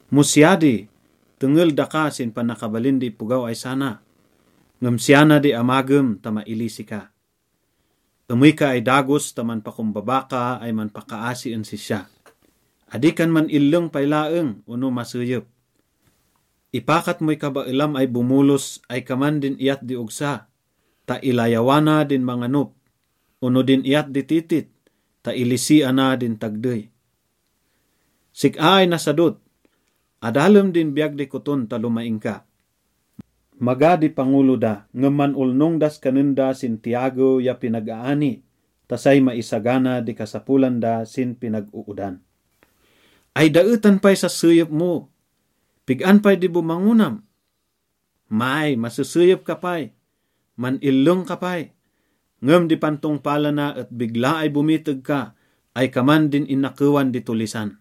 Mo siya di, tengel daka sin panakabalin di ipogaw ay sana, ngem siya na di amagem ta mailisi ka: emey ka ay dagos ta manpakombaba ka ay manpakaasi en sisya. Adi kan man-illeng pay laeng ono maseyep. Ipakat moy kabaelam ay bomolos ay kaman din iyat di ogsa ta ilayawana din manganop ono din iyat di titit ta ilisiana din tagdey. Sik-a ay nasadot, adalem din biyag di koton ta lomaing ka. Maga di pangolo da, ngem man-olnong das kanen da sin tiyagew ya pinag-aani ta say maisagana di kasapolan da sin pinag-oodan. Ay daetan pay sas seyep mo? Pig-an pay di bomangonam? May, maseseyep ka pay, man-illeng ka pay, ngem di pantongpalana et bigla ay bomiteg ka ay kaman din inakewan di tollisan.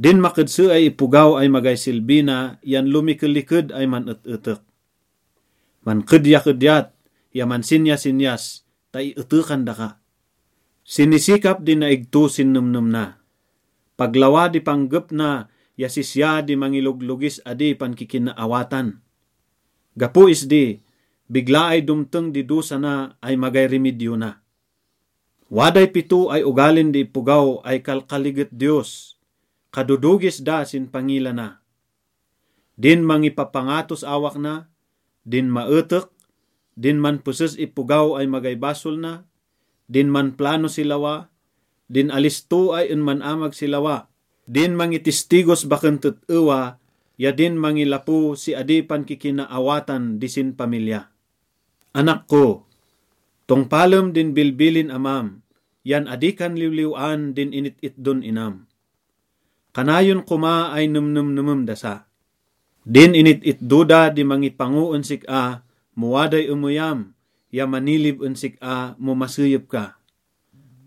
Din makedse ay ipogaw ay magay silbi na yan lomikeliked ay man-et-etek. Mankedyakedyat ya mansinyasinyas ta ietekan daka. Sinisikap di naigto sin nemnem na, pag lawa di panggep na ya sisya di mangiloglogis adi pankikinaawatan. Gapo isdi, bigla ay domteng di dosa na ay magay rimidyo na. Waday pito ay ogalin di ipogaw ay kalkaliget Diyos, kadodogis da sin pangila na: din mangipapangatos awak na, din maetek, din manpeses ipogaw ay magay basol na, din manplano si lawa, din alisto ay en man-amag si lawa, din mangitistigos baken tet-ewa ya din mangilapo si adi pankikinaawatan di sinpamilya. Anak ko, tongpalem din bilbilin amam yan adi kan liwliw-an din init-itdon inam. Kanayon koma ay nemnemnemem dasa. Din init-itdo da di mangipango en sik-a mo waday emeyam ya manilib en sik-a mo maseyep ka.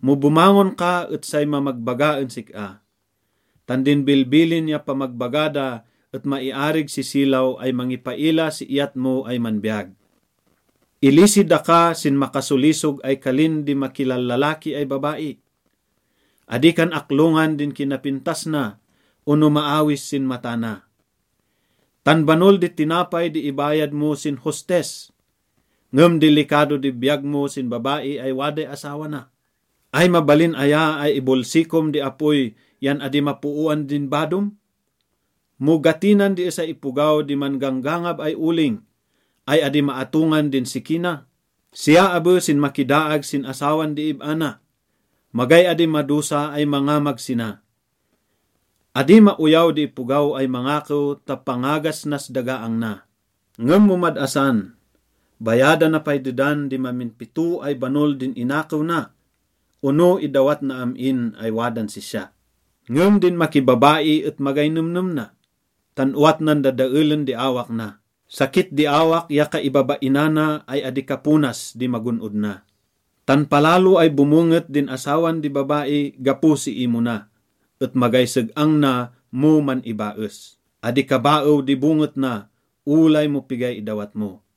Mo bomangon ka et say mamagbaga en sik-a. Tan din bilbilin ya pamagbaga da et maiarig si silaw ay mangipaila si iyat mo ay manbiyag. Ilisi daka sin makasolisog ay kalin di makilallalaki ay babai. Adi kan aklongan din kinapintas na ono maawis sin mata na. Tan banol di tinapay di ibayad mo sin hostess, ngem dilikado di biyag mo sin babai ay waday asawa na. Ay mabalin aya ay ibolsikom di apoy yan adi mapooan din badom? Mo gatinan di esay ipogaw di man-ganggangab ay oling, ay adi maatongan din siki na? Siya abe sin makidaag sin asawan di ib-a na, magay adi madosa ay mangamag sina. Adi maoyaw di ipogaw ay mangakew ta pangagas nas dagaang na. Ngem mo mad-asan, bayadana pay dedan di mamin pito ay banol din inakew na ono idawat na am-in ay wadan sisya. Ngem din makibabai et magay nemnem na, tan owat nan dadaelen di awak na. Sakit di awak ya kaibabainana ay adi kaponas di magon-od na. Tan palalo ay bomonget din asawan di babai gapo si imona, et magay seg-ang na mo man-ibaes. Adi kabaew di bonget na olay mo pigay idawat mo.